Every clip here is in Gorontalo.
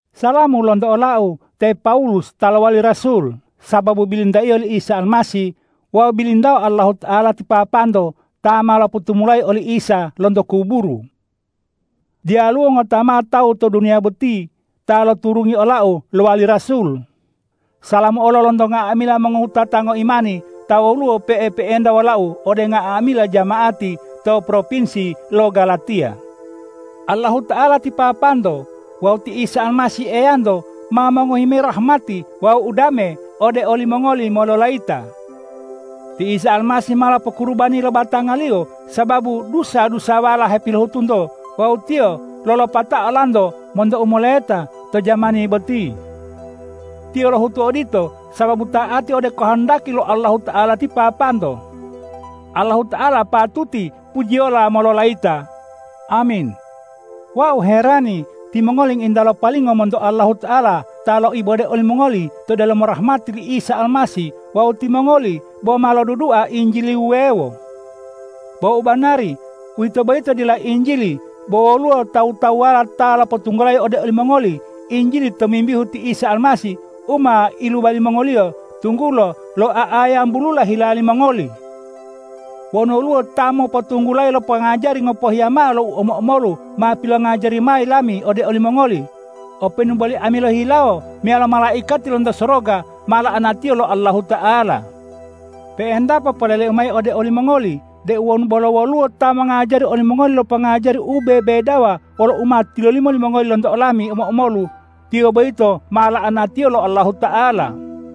Salamu lonto olau te Pawulus ta lowali rasul sababu bilintaiyo li Isa Almasih wawu bilintao Allahuta'ala ti Papanto ta ma lopotumulayi oli Isa lonto kuburu. Diyaluwo ngota mao tawu to duniya boti ta loturungi olau lowali rasul. Salamu olo lonto nga'amila mongowutata ngoimani ta woluwo pe'epe'enta wolau ode nga'amila jama'ati to propinsi lo Galatiya. Allahuta'ala ti Papanto wawu ti Isa Almasih Eyanto ma mongohi mayi rahmati wawu udame ode olimongoli mololayita. Ti Isa Almasih ma lopokurubani lo batanga-Liyo sababu dusa-dusawala hepilohutunto wawu Tiyo lolopatao olanto monto u moleta to jamani boti. Tiyo lohutu odito sababu ta'ati ode kohondaki lo Allahuta'ala ti Papanto. Allahuta'ala patuti pujiyola mololayita! Amin. Wau herani, timongoli ngointa lopalingo monto Allahuta'ala ta loibode olimongoli to delomo rahmati li Isa Almasih wawu timongoli bo ma lodudua injili wuwewo. Bo u banari, uwito boyito dila injili bo woluwo tawu-tawuwala ta lopotunggulayi ode olimongoli Injili tomimbihu ti Isa Almasih u ma iluba limongoliyo tunggulo lo'oa'ayambulula hila limongoli. Wonu woluwo ta mopotunggulayi lo pongajari ngopohiya mao lo u omo-omolu ma pilongajari mayi lami ode olimongoli, openu boli ami lohihilawo meyalo malaikati lonto soroga, ma la'anatiyo lo Allahuta'ala. Pe'entapo poleleu mayi ode olimongoli deu wonu bolo woluwo ta mongajari olimongoli lo pongajari u bebedawa wolo u ma tilolimo limongoli lonto olami omo-omolu, tiyo boyito ma la'anatiyo lo Allahuta'ala.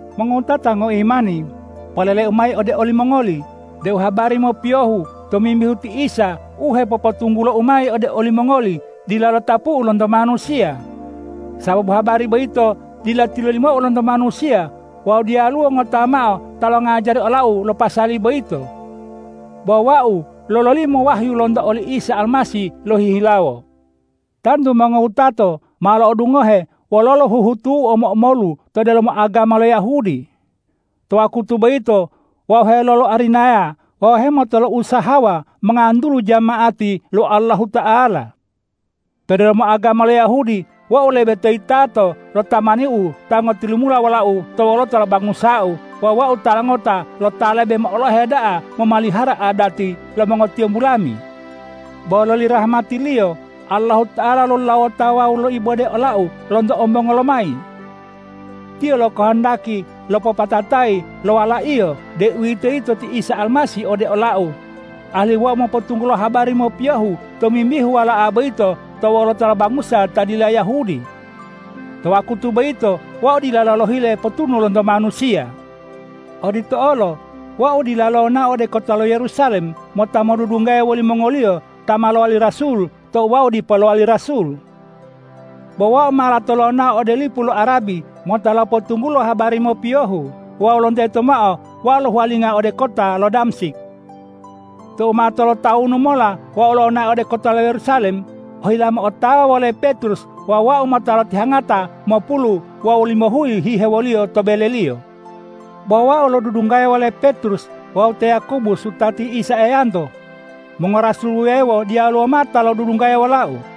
Mongowutata ngoimani, poleleu mayi ode olimongoli deu habari mopiyohu tomimbihu ti Isa u hepopotunggulou mayi ode olimongoli dila lotapu'u lonto manusiya. Sababu habari boyito dila tilolimou lonto manusiya wawu diyaluwo ngota mao ta longajari olau lo pasali boyito. Bo wau lololimo wahyu lonto oli Isa Almasih lohihilawo. Tantu mongowutato ma lo'odungohe wololo huhutu'u u omo-omolu to delomo agama lo Yahudi. To wakutu boyito wau heloloarinayawa wawu hemotolousahawa mongantulu jama'ati lo Allahuta'ala. To delomo agama lo Yahudi wau lebe to yitatao lo tamaniu ta ngotilumula wolau to wolota lo bangusau wawu wau tala ngota lo ta lebe mo'olohe da'a momalihara adati lo mongotiyombu lami. Bo loli rahmati-Liyo Allahuta'ala lolulawoto wawu loibode olau lonto ombongo lomayi. Tiyo lokohondaki lopopatatayi lo Wala-Iyo, deuwitoyito ti Isa Almasih ode olau, alihu wau mopotunggulo habari mopiyohu tomimbihu Wala'a boyito to wolota lo bangusa ta dila Yahudi. To wakutu boyito wau dilalo lohile potunu lonto manusiya. Odito olo wau dila lonao ode kota lo Yerusalem mota modudunggaya wolimongoliyo ta ma lowali rasul tou wau dipo lowali rasul. Bo wau ma lato lonao ode lipu lo Arabi mota lopotunggulo habari mopiyohu wawu lonteto mao wau lohuwalinga ode kota lo Damsik. Tou ma tolotawunu mola wau lonao ode kota lo Yerusalem ohila mo'otawa wole Petrus wawu wau mota lotihangata mopulu wawu limohuyi hihewoliyo to beleliyo. Bo wau bo lodudunggaya wole Petrus wawu te Yakobus wutati Isa Eyanto; mongorasul wuwewo diyaluwo mao ta lodudunggaya wolau.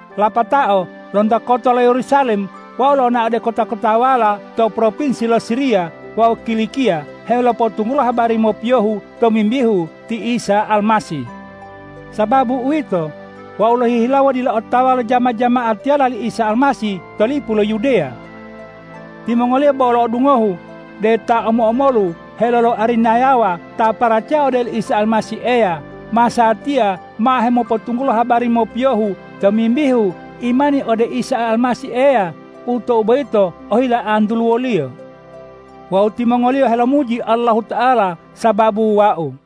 Lapatao lonto kota lo Yerusalem wau lonao ode kota-kotawala to propinsi lo Siriya wawu Kilikiya helopotunggulo habari mopiyohu tomimbihu ti Isa Almasih. Sababu uwito, wau lohihilawo dila otawa lo jama-jama'atiyala li Isa Almasih to lipu lo Yudeya. Timongoliyo bo lo'odungohu deu ta omo-omolu heloloarinayawa ta paracaya ode oli Isa Almasih Eya, masatiya ma hemopotunggulo habari mopiyohu tomimbihu imani ode Isa Almasih Eya u tou boyito ohila antuluwoliyo. Wawu timongoliyo helomuji Allahuta'ala sababu wau.